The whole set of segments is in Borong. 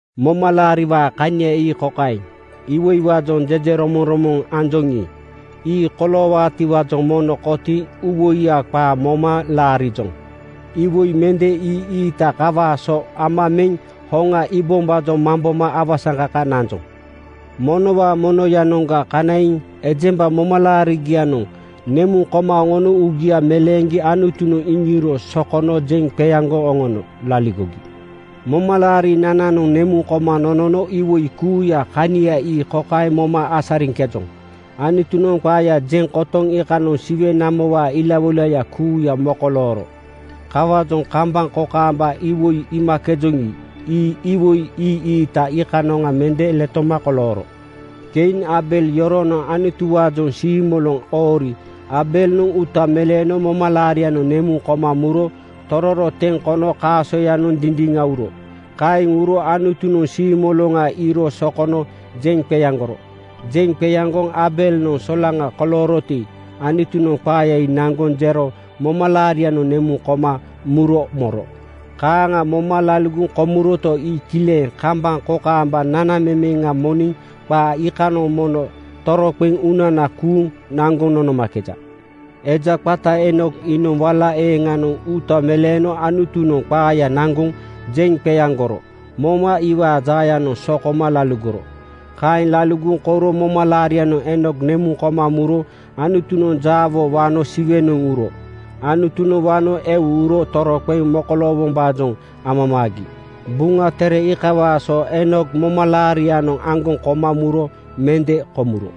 Momalaariwaa kania ii kokaeŋ: Iwoiwaajoŋ jejeromoŋromoŋ anjoŋi, ii koloowaatiwaajoŋ mono kotiiŋ uuwoiya qaa moma laarijoŋ. Iwoi mende ii-iita iikawaa so ama meŋ hoŋa iibombaajoŋ mamboma awasaŋkaka nanjoŋ. Monowaa monoyanoŋga kanaiŋ ejemba momalaarigianoŋ nemuŋ koma oŋono uugia meleeŋgi Anutunoŋ iŋiiro sokono jeŋ qeaŋgoŋ oŋono laligogi. Momalaarinananoŋ nemuŋ koma nonono iwoi kuuyaa kania ii kokaeŋ moma asariŋkejoŋ: Anutunoŋ qaaya jeŋ kotoŋ iikanoŋ Siwe namowaa ilawoilaya kuuya mokolooro. Kawaajoŋ kambaŋ kokaamba iwoi iimakejoŋi, ii iwoi ii-iita iikanoŋa mende letoma kolooro. Kein (Kain) Aabel yoronoŋ Anutuwaajoŋ siimoloŋ oori Aabelnoŋ uuta meleeno momalaarianoŋ nemuŋ koma muro tororo teŋ kono kaasoyanoŋ dindiŋa uro. Kaeŋ uro Anutunoŋ siimoloŋa iiro sokono jeŋ qeaŋgoro. Jeŋ qeaŋgoŋ Aabelnoŋ solaŋa kolooroti, Anutunoŋ qaaya ii naŋgoŋ jero momalaarianoŋ nemuŋ koma muro moro. Kaaŋa moma laligoŋ komuroto, ii kileŋ kambaŋ kokaamba nanamemeŋa moniŋ qaa iikanoŋ mono toroqeŋ uunana kuuŋ naŋgoŋ nonomakeja. Eja qata Eenok iinoŋ wala eeŋanoŋ uuta meleeno Anutunoŋ qaaya naŋgoŋ jeŋ qeaŋgoro moma iwaa jaayanoŋ sokoma laligoro. Kaeŋ laligoŋ kouro momalaarianoŋ Eenok nemuŋ koma muro Anutunoŋ jaawo wano Siwenoŋ uro. “Anutunoŋ wano eu uro toroqeŋ mokoloowombaajoŋ amamaagi.” Buŋa Tere iikawaa so Eenok momalaarianoŋ aŋgoŋ koma muro mende komuro.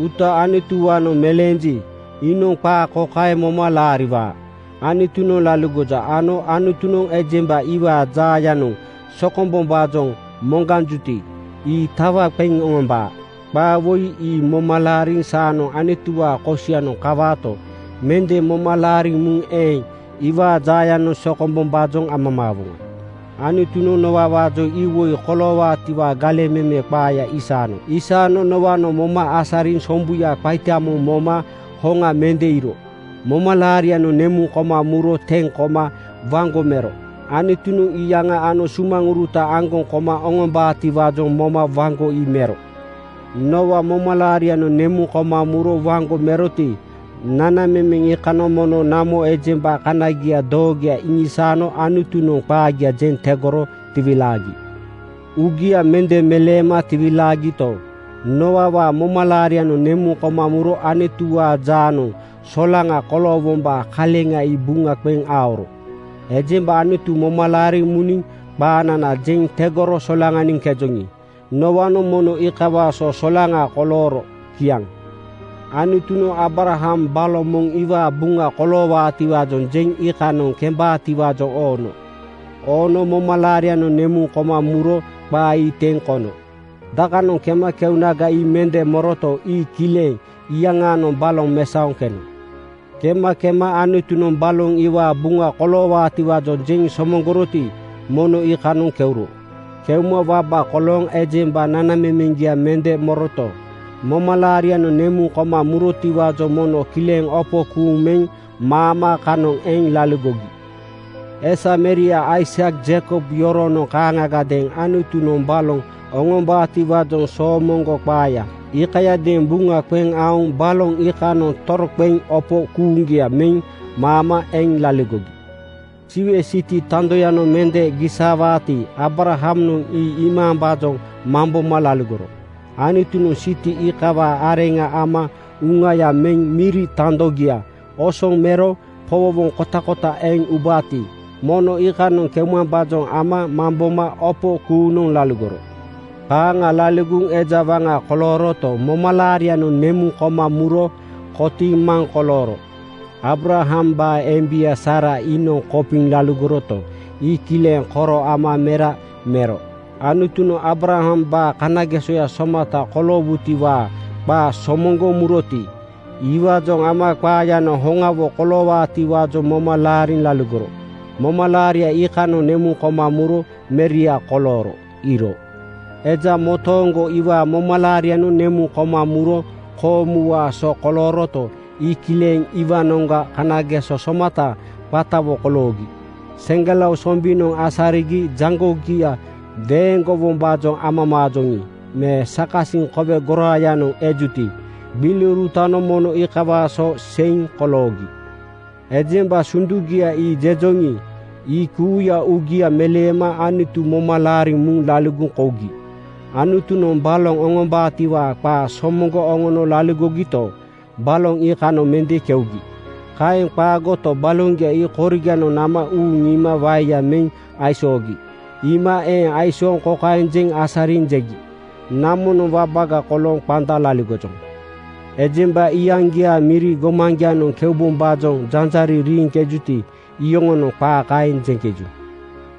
Uuta Anutuwaanoŋ meleenji, iinoŋ qaa kokaeŋ moma laariwaa: Anutunoŋ laligoja ano Anutunoŋ ejemba iwaa jaayanoŋ sokombombaajoŋ moŋganjuti, ii tawa qeŋ oŋombaa. Qaa woi ii moma laariŋ saanoŋ Anutuwaa kosianoŋ kawaato, mende moma laariŋ muŋ eeŋ iwaa jaayanoŋ sokombombaajoŋ amamaawoŋa. Anutunoŋ Nooawaajoŋ iwoi koloowaatiwaa galeŋ meme qaaya isaano. Aisano Nooanoŋ moma asariŋ sombuya qaita moŋ moma hoŋa mende iiro momalaarianoŋ nemuŋ koma muro teŋ koma waŋgo mero. Anutunoŋ iyaŋa ano sumaŋuruta aŋgoŋ koma oŋom-baatiwaajoŋ moma waŋgo ii mero. Nooa momalaarianoŋ nemuŋ koma muro waŋgo meroti, nanamemeŋ iikanoŋ mono namo ejemba kanagia doogoya iŋisaano Anutunoŋ qaagia jeŋ tegoro tiwilaagi. Uugia mende meleema tiwilaagito, Nooawaa momalaarianoŋ nemuŋ koma muro Anutuwaa jaanoŋ solaŋa koloowombaa kaleŋa ii buŋa qeŋ aoro. Ejemba Anutu moma laariŋ muniŋ qaanana jeŋ tegoro solaŋaniŋkejoŋi, Nooanoŋ mono iikawaa so solaŋa kolooro. Kiaŋ. Anutunoŋ Aabraham baloŋ moŋ iwaa buŋa koloowaatiwaajoŋ jeŋ iikanoŋ kembaatiwaajoŋ oono. Oono momalaarianoŋ nemuŋ koma muro qaa ii teŋ kono. Dakanoŋ kema keunaga ii mende moroto, ii kileŋ iyaŋaanoŋ baloŋ mesaoŋ keno. Kema kema Anutunoŋ baloŋ iwaa buŋa koloowaatiwaajoŋ jeŋ somoŋgoroti, mono iikanoŋ keuro. Keuma waba kolooŋ ejemba nanamemeŋgia mende moroto, momalaarianoŋ nemuŋ koma murotiwaajoŋ mono kileŋ opo kuuŋ meŋ maama kanoŋ eŋ laligogi. Esameria Aisak Jeikob yoronoŋ kaaŋagadeeŋ Anutunoŋ baloŋ oŋombaatiwaajoŋ soomoŋgo qaaya iikayadeeŋ buŋa qeŋ aoŋ baloŋ iikanoŋ toroqeŋ opo kuuŋgia meŋ maama eŋ laligogi. Siwe siti tandoyanoŋ mende gisaawaati, Aabrahamnoŋ ii iimambaajoŋ mamboma laligoro. Anutunoŋ siti iikawaa areŋa ama uŋaya meŋ miri tandogia osoŋ mero powowoŋ kotakota eŋ ubaati, mono iikanoŋ keumambaajoŋ ama mamboma opo kuuŋnoŋ laligoro. Kaaŋa laligoŋ eja waŋa kolooroto, momalaarianoŋ nemuŋ koma muro kotiiŋ maŋ kolooro. Aabrahambaa embia Saara iinoŋ kopiŋ laligoroto, ii kileŋ koro ama mera mero. Anutunoŋ Aabrahambaa kanagesoya somata koloowaatiwaa qaa somoŋgoŋ muroti, iwaajoŋ ama qaayanoŋ hoŋawo koloowaatiwaajoŋ moma laariŋ laligoro. Momalaaria iikanoŋ nemuŋ koma muro meria kolooro iiro. Eja motooŋgo iwaa momalaarianoŋ nemuŋ koma muro koomuwaa so kolooroto, ii kileŋ iwaanoŋga kanageso somata qatawo koloogi. Seŋgelao sombinoŋ asarigi jaŋgogia weeŋgowombaajoŋ amamaajoŋi, me sakasiŋ kowe goraayanoŋ ejuti, gbiliurutanoŋ mono iikawaa so seiŋ koloogi. Ejemba sundugia ii jejoŋi, ii kuuya uugia meleema Anutu moma laariŋ muŋ laligoŋ komugi. Anutunoŋ baloŋ oŋombaatiwaa qaa somoŋgoŋ oŋono laligogito, baloŋ iikanoŋ mende keugi. Kaeŋ qaagoto, baloŋgia ii koriganoŋ nama uuŋ iima waeya meŋ aisoogi. Iima eeŋ aisooŋ kokaeŋ jeŋ asariŋ jegi, “Namonoŋ wabaga kolooŋ qanda laligojoŋ.” Ejemba iyaŋgiaa miri gomaŋgianoŋ keubombaajoŋ janjariŋ riiŋkejuti, iyoŋonoŋ qaa kaeŋ jeŋkeju.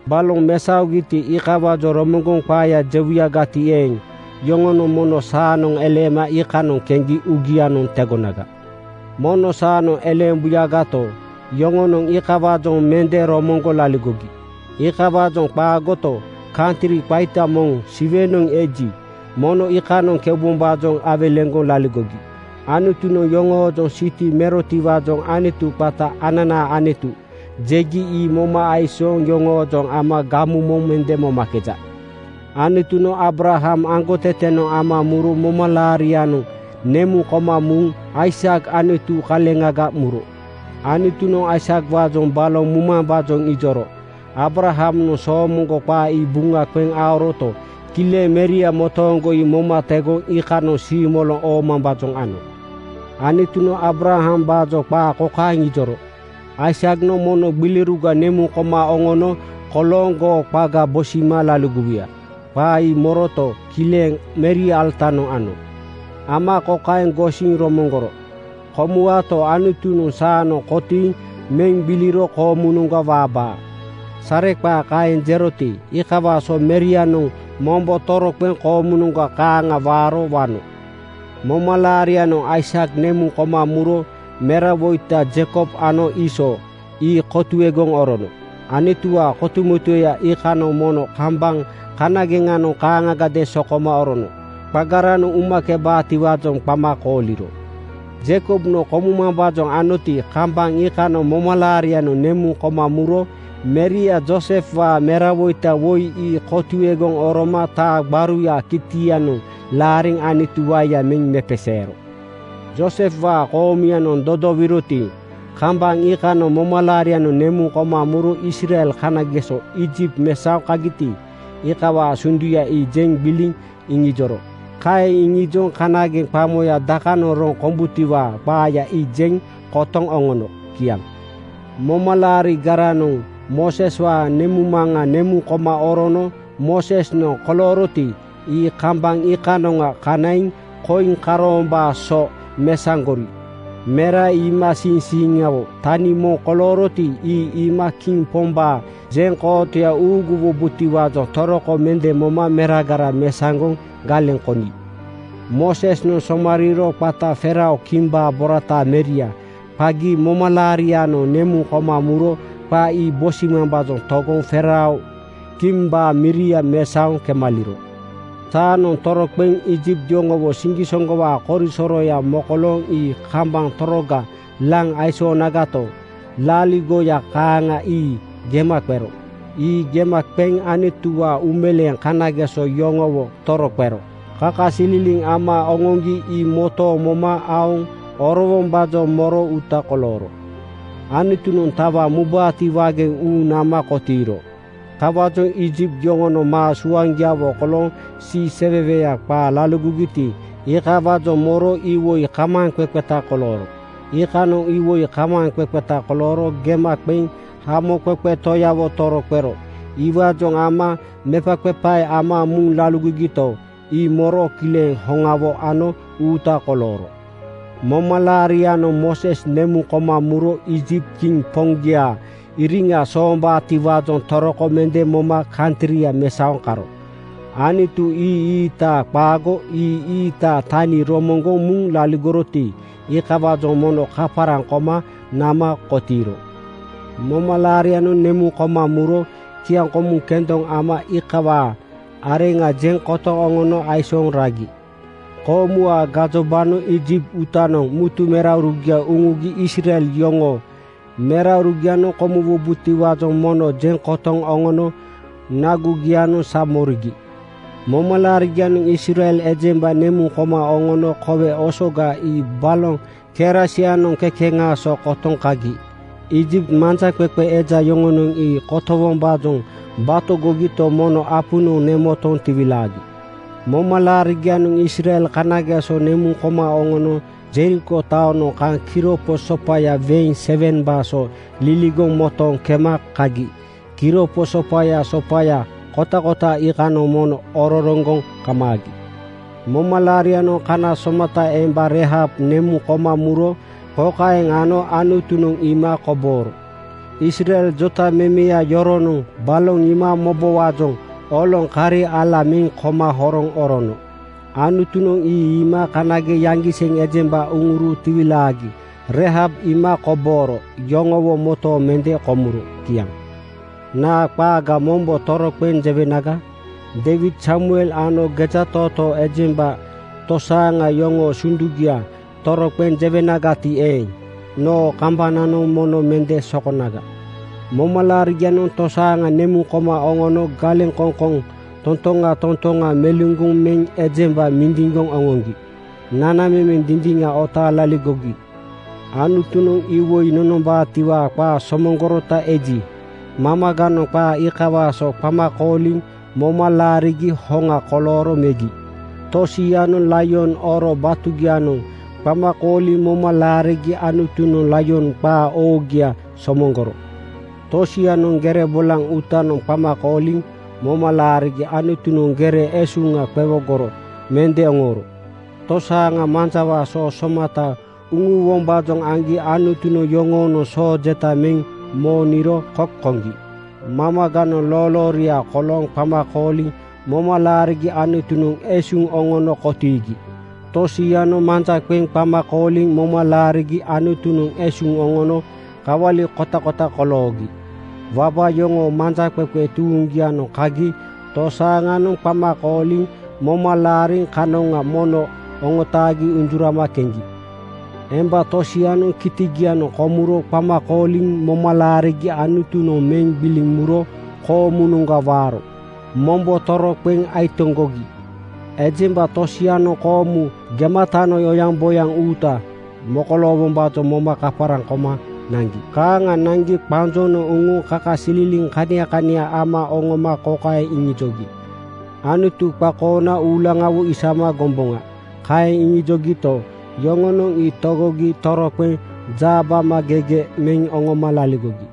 Baloŋ mesaogiti, iikawaajoŋ romoŋgoŋ qaaya jewuyagati eeŋ, yoŋonoŋ mono saanoŋ eleema iikanoŋ keŋgi uugianoŋ tegonaga. Mono saanoŋ eleembuyagato, yoŋonoŋ iikawaajoŋ mende romoŋgoŋ laligogi. Iikawaajoŋ qaagoto, kantri qaita moŋ Siwenoŋ eji, mono iikanoŋ keubombaajoŋ awelegoŋ laligogi. Anutunoŋ yoŋoojoŋ siti merotiwaajoŋ Anutu qata “Ananaa Anutu!” jegi ii moma aisooŋ yoŋoojoŋ ama gamu moŋ mende momakeja. Anutunoŋ Aabraham aŋgotetenoŋ ama muro momalaarianoŋ nemuŋ koma muŋ Aisak Anutu kaleŋga muro. Anutunoŋ Aisakwaajoŋ baloŋ mumambaajoŋ ijoro Aabrahamnoŋ soomoŋgo qaa ii buŋa qeŋ aoroto, kileŋ meria motooŋgo ii moma tegoŋ iikanoŋ siimoloŋ oomambaajoŋ ano. Anutunoŋ Aabrahambaajoŋ qaa kokaeŋ ijoro, “Aisaknoŋ mono gbiliuruga nemuŋ koma oŋono kolooŋ goo qaga bosima laligowuya.” Qaa ii moroto, kileŋ meria alatanoŋ ano. Ama kokaeŋ gosiŋ romoŋgoro, “Komuwaato, Anutunoŋ saanoŋ kotiiŋ meŋ gbiliro koomunoŋga waabaa.” Sareqaa kaeŋ jeroti, iikawaa so merianoŋ mombo toroqeŋ koomunoŋga kaaŋa waaro wano. Momalaarianoŋ Aisak nemuŋ koma muro merawoita Jeikob ano Iisoo (Eesau) ii kotuegoŋ orono. Anutuwaa kotumotueya iikanoŋ mono kambaŋ kanageŋanoŋ kaaŋagadeeŋ sokoma orono qagaranoŋ umakebaatiwaajoŋ qama kooliro. Jeikobnoŋ komumambaajoŋ anoti, kambaŋ iikanoŋ momalaarianoŋ nemuŋ koma muro meria Joosefwaa merawoita woi ii kotuegoŋ oroma taa gbaruyaa kitianoŋ laariŋ Anutu waeya meŋ mepeseero. Joosefwaa koomuyanoŋ dodowiroti, kambaŋ iikanoŋ momalaarianoŋ nemuŋ koma muro Israel kanageso Iijipt mesaoŋ kagiti, iikawaa sunduya ii jeŋ gbiliŋ iŋijoro. Kaeŋ iŋijoŋ kanageŋ qamoya dakanoŋ roŋ kombutiwaa qaaya ii jeŋ kotoŋ oŋono. Kiaŋ. Momalaarigaranoŋ Mooseswaa nemuŋmaŋa nemuŋ koma orono Moosesnoŋ kolooroti, ii kambaŋ iikanoŋa kanaiŋ koiŋ karoombaa so mesaŋgori. Mera ii iimasiiŋsiiŋawo tania moŋ kolooroti, ii iima kiŋ pombaa jeŋkootoya uuguwobotiwaajoŋ toroko mende moma meragara mesaŋgoŋ galeŋ koni. Moosesnoŋ somariiro qata faarao kimbaa borataa meria qagi momalaarianoŋ nemuŋ koma muro qa ii bosimambaajoŋ togoŋ faarao kimbaa miria mesaoŋ kemaliro. Saanoŋ toroqeŋ Iijipt yoŋowo siŋgisoŋgowaa korisoroya mokolooŋ ii kambaŋ toroga laŋ aisoonagato, laaligoya kaaŋa ii gema qero. Ii gema qeŋ Anutuwaa uumeleeŋ kanageso yoŋowo toroqero kakasililiŋ ama oŋoŋgi ii motooŋ moma aoŋ orowombaajoŋ moro uuta kolooro. Anutunoŋ tawa mubaatiwaageŋ uuŋ nama kotiiro. Kawaajoŋ Iijipt yoŋonoŋ maa suaŋgiawo kolooŋ siiseweweya qaa laligogiti, iikawaajoŋ moro iwoi kamaaŋqeqeta kolooro. Iikanoŋ iwoi kamaaŋqeqeta kolooro gema qeŋ Hamoqeqe Toyawo toroqero iwaajoŋ ama mepaqepae ama muŋ laligogito, ii moro kileŋ hoŋawo ano uuta kolooro. Momalaarianoŋ Mooses nemuŋ koma muro Iijipt kiŋ poŋgiaa iriŋa soombabotiwaajoŋ toroko mende moma kantria mesaoŋ karo. Anutu ii-iita qaago ii ii-iitaa tani romoŋgoŋ muŋ laligoroti, iikawaajoŋ mono kaparaŋ koma nama kotiiro. Momalaarianoŋ nemuŋ koma muro kiaŋkomu kendoŋ ama iikawaa areŋa jeŋ kotoŋ oŋono aisooŋ ragi. Koomuwaa gajobanoŋ Iijipt uutanoŋ mutu meraurugia uŋugi Israel yoŋoo meraurugianoŋ komuwubotiwaajoŋ mono jeŋ kotoŋ oŋono nagugianoŋ sa morigi. Momalaarigianoŋ Israel ejemba nemuŋ koma oŋono Kowe Osoga ii baloŋ kerasianoŋ kekeŋaa so kotoŋ kagi. Iijipt manjaqeqe eja yoŋonoŋ ii kotowombaajoŋ batogogito, mono apunoŋ nemotoŋ tiwilaagi. Momalaarigianoŋ Israel kanageso nemuŋ koma oŋono Jeriko taonoŋ kaŋ kiropo sopaya weeŋ 7:baa so liligoŋ motooŋ kema kagi kiropo sopaya sopaya kotakota iikanoŋ mono ororoŋgoŋ kamaagi. Momalaarianoŋ kana somata emba Reihab nemuŋ koma muro kokaeŋ ano Anutunoŋ iima kobooro: Israel jotamemeya yoronoŋ baloŋ iima mobowaajoŋ oloŋ kari ala meŋ koma horoŋ orono. Anutunoŋ ii iima kanageŋ yaŋgiseŋ ejemba uŋuro tiwilaagi Reihab iima kobooro yoŋowo motooŋ mende komuro. Kiaŋ. Naa qaaga mombo toroqeŋ jewenaga? Deiwid, Samuel ano gejatootoo ejemba tosaaŋa yoŋoo sundugia toroqeŋ jewenagati eeŋ, noo kambananoŋ mono mende sokonaga. Momalaarigianoŋ tosaaŋa nemuŋ koma oŋono galeŋkoŋkoŋ totoŋa totoŋa meluŋgoŋ meŋ ejemba mindiŋgoŋ oŋoŋgi nanamemeŋ dindiŋa otaaŋ laligogi. Anutunoŋ iwoi nonombaatiwaa qaa somoŋgorota eji, mamaganoŋ qaa iikawaa so qama kooliŋ moma laarigi hoŋa kolooro megi. Tosianoŋ laion oro batugianoŋ qama kooliŋ moma laarigi Anutunoŋ laion qaa oogia somoŋgoro. Tosianoŋ gere bolaŋ uutanoŋ qama kooliŋ moma laarigi Anutunoŋ gere esuŋa qowogoro mende oŋooro. Tosaaŋa manjawaa soo somatanoŋ uŋuwombaajoŋ aŋgi Anutunoŋ yoŋoonoŋ soo jeta meŋ mooniro kok koŋgi. Mamaganoŋ loolooria kolooŋ qama kooliŋ moma laarigi Anutunoŋ esuŋ oŋono kotiigi. Tosianoŋ manja qeŋ qama kooliŋ moma laarigi Anutunoŋ esuŋ oŋono kawali kotakota koloogi. Waba yoŋoo manjaqeqe tuuŋgianoŋ kagi tosaaŋanoŋ qama kooliŋ moma laariŋ kanoŋa mono oŋotaagi unjurama keŋgi. Emba tosianoŋ kitigianoŋ komuro qama kooliŋ moma laarigi Anutunoŋ meŋ gbiliŋ muro koomunoŋga waaro mombo toroqeŋ aitoŋgogi. Ejemba tosianoŋ koomu gematanoŋ oyaŋboyaŋ uuta mokoloowombaajoŋ moma kaparaŋ koma naŋgi. Kaaŋa naŋgi qanjonoŋ uŋuŋ kakasililiŋ kania kania ama oŋoma kokaeŋ iŋijogi, “Anutu qakoona uulaŋawo isama gomboŋa.” Kaeŋ iŋijogito, yoŋonoŋ ii togogi toroqeŋ jaabamagege meŋ oŋoma laligogi.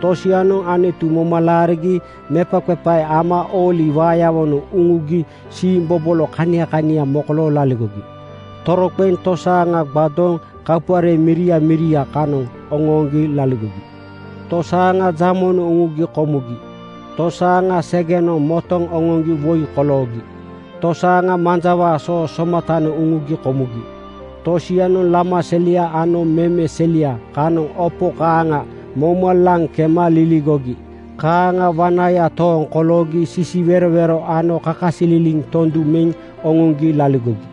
Tosianoŋ Anutu moma laarigi mepaqepae ama ooli waayawonoŋ uŋugi siimbobolo kania kania mokolooŋ laligogi. Toroqeŋ tosaaŋa gbadooŋ kapuare miria miria kanoŋ oŋooŋgi laligogi. Tosaaŋa jamonoŋ uŋugi komugi. Tosaaŋa segenoŋ motoŋ oŋoŋgi woi koloogi. Tosaaŋa manjawaa soo somatanoŋ uŋugi komugi. Tosianoŋ lama selia ano meme selia kanoŋ opo kaaŋa mouma laŋ kema liligogi. Kaaŋa wanaya tooŋ koloogi sisiwerowero ano kakasililiŋ tondu meŋ oŋoŋgi laligogi.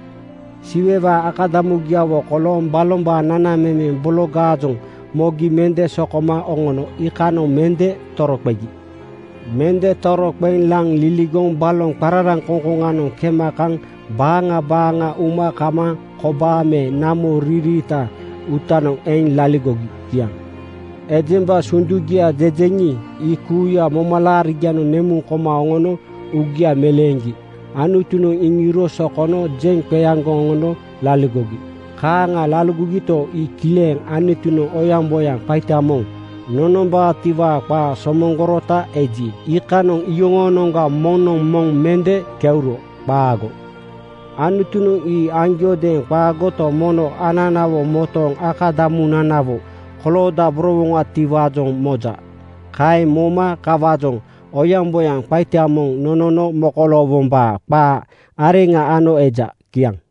Siwewaa akadamugiawo kolooŋ balombaa nanamemeŋ bologaajoŋ mogi mende sokoma oŋono iikanoŋ mende toroqegi. Mende toroqeŋ laŋ liligoŋ baloŋ qararaŋkoŋkoŋanoŋ kema kaŋ baaŋa baaŋa uma kamaaŋ kobaa me namo riiriitaa uutanoŋ eŋ laligogi. Kiaŋ. Ejemba sundugia jejeŋi, ii kuuya momalaarigianoŋ nemuŋ koma oŋono uugia meleeŋgi Anutunoŋ iŋiiro sokono jeŋ qeaŋgoŋ oŋono laligogi. Kaaŋa laligogito, ii kileŋ Anutunoŋ oyaŋboyaŋ qaita moŋ nonombaatiwaa qaa somoŋgorota eji, iikanoŋ iyoŋoonoŋga moŋnoŋ moŋ mende keuro. Qaago. Anutunoŋ ii aŋgiodeeŋ qaagoto, mono ananawo motooŋ akadamunanawo koloodaborowoŋatiwaajoŋ moja. Kaeŋ moma kawaajoŋ oyaŋboyaŋ qaita moŋ nonono mokoloowombaa qaa areŋa ano eja. Kiaŋ.